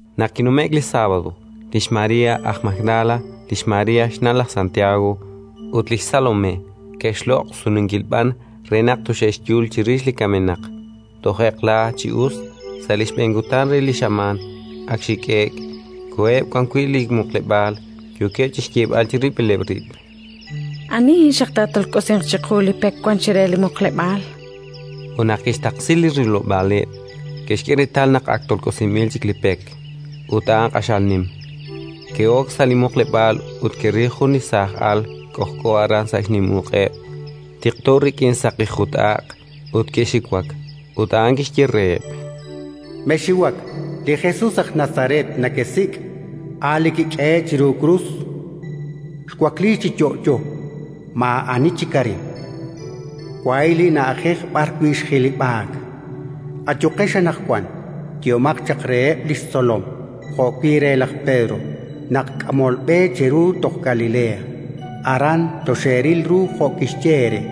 Naq kinume'k li sábado, lix María aj Magdala, lix María xna' laj Santiago, ut li xSalomé ke'xloq' sununkil b'an re naq toxe'xyul chirix li kamenaq. Toj eq'la chi us, sa' li xb'een kutan re li xamaan, ak xhik'e'k, koheb' wan wi' li muqleb'aal, yookeb' chi xyeeb'al chirib'ileb' rib': —Ani xaq taatolk'osinq chiqu li pek wank chire li muqleb'aal? Ut naq ke'xtaqsi li rilob'aaleb', ke'xk'e reetal naq ak tolk'osinb'il chik li pek; ut a'an q'axal nim. Ke'ok sa' li muqleb'aal ut ke'ril jun li saaj al k'ojk'o aran sa' xnim uq'eb', tiqto rik'in saqi jut-aq'; ut ke'xiwak. Ut a'an kixye reheb': —Mexxiwak. Li Jesus aj Nazaret nekesik', a' li kik'ehe'k chiru krus. Xwakliik chi yo'yo, maa'ani chik arin. Wahi' li na'ajej b'arwi' xjilib'aak. Ayuqex anaqwan, yehomaq chaq reheb' li xtzolom jo'wi' re laj Pedro naq k'amolb'e cheru toj Galilea; aran toxeeril ru jo' kixye eere.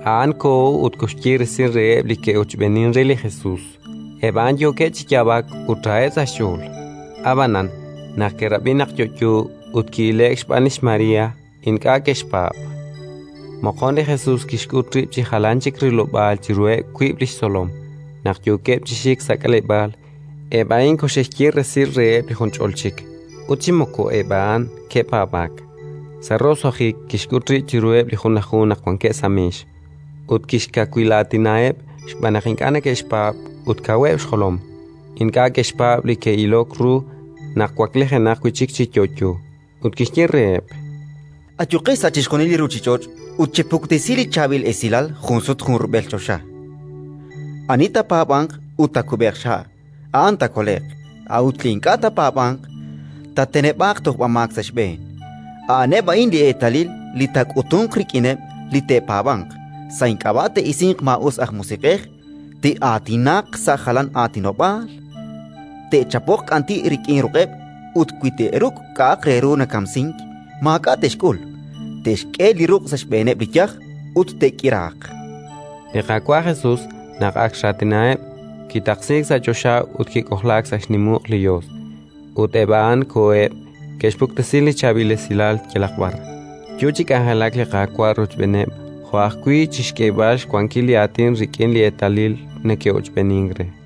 A'an koho ut koxye resil reheb' li ke'ochb'eenink re li Jesus: eb' a'an yookeb' chi yaab'ak ut raheb' sa' xch'ool. Ab'anan, naq ke'rab'i naq yo'yo ut ki'ile'k xb'aan lix María, ink'a' ke'xpaab'. Moqon li Jesus kixk'ut rib' chi jalan chik rilob'aal chiruheb' wiib' li xtzolom, naq yookeb' chi xik sa' k'aleb'aal. Eb' a'in koxe'xye resil reheb' li junch'ol chik, ut chi moko eb' a'an ke'paab'aak. Sa' roso'jik kixk'ut rib' chiruheb' li Junlaju naq wankeb' sa' meex, ut kixkawilaatinaheb' xb'aan naq ink'a' neke'xpaab' ut kaweb' xjolom: ink'a' ke'xpaab' li ke'ilok ru naq waklijenaq wi' chik chi yo'yo. Ut kixye reheb': “Ayuqex sa' chixjunil li ruuchich'och' ut chepuktesi li Chaab'il Esilal junsut junrub'el choxa. Ani taapaab'anq ut taakub'eeq xha', a'an taakole'q; a'ut li ink'a' taapaab'anq, taateneb'aaq tojb'amaak sa' xb'een. A'aneb' a'in li eetalil li taak'utunq rik'ineb' li te'paab'anq: sa' ink'ab'a' te'isinq maa'us aj musiq'ej, te'aatinaq sa' jalan aatinob'aal, te'chapoq k'anti' rik'in ruq'eb' ut, wi te'ruk' k'a'aq re ru nakamsink, maak'a' te'xk'ul; te'xk'e li ruq' sa' xb'eeneb' li yaj ut te'k'iraaq”. Li Qaawa' Jesus, naq ak xraatinaheb', kitaqsiik sa' choxa ut kik'ojlaak sa' xnim uq' li Yos. Ut eb' a'an koheb', ke'xpuktesi li Chaab'il Esilal yalaq b'ar, yo chi k'anjelak li Qaawa' rochb'eeneb' jo'wi' chi xk'eeb'al xwankil li Aatin rik'in li eetalil neke'ochb'eenink re.]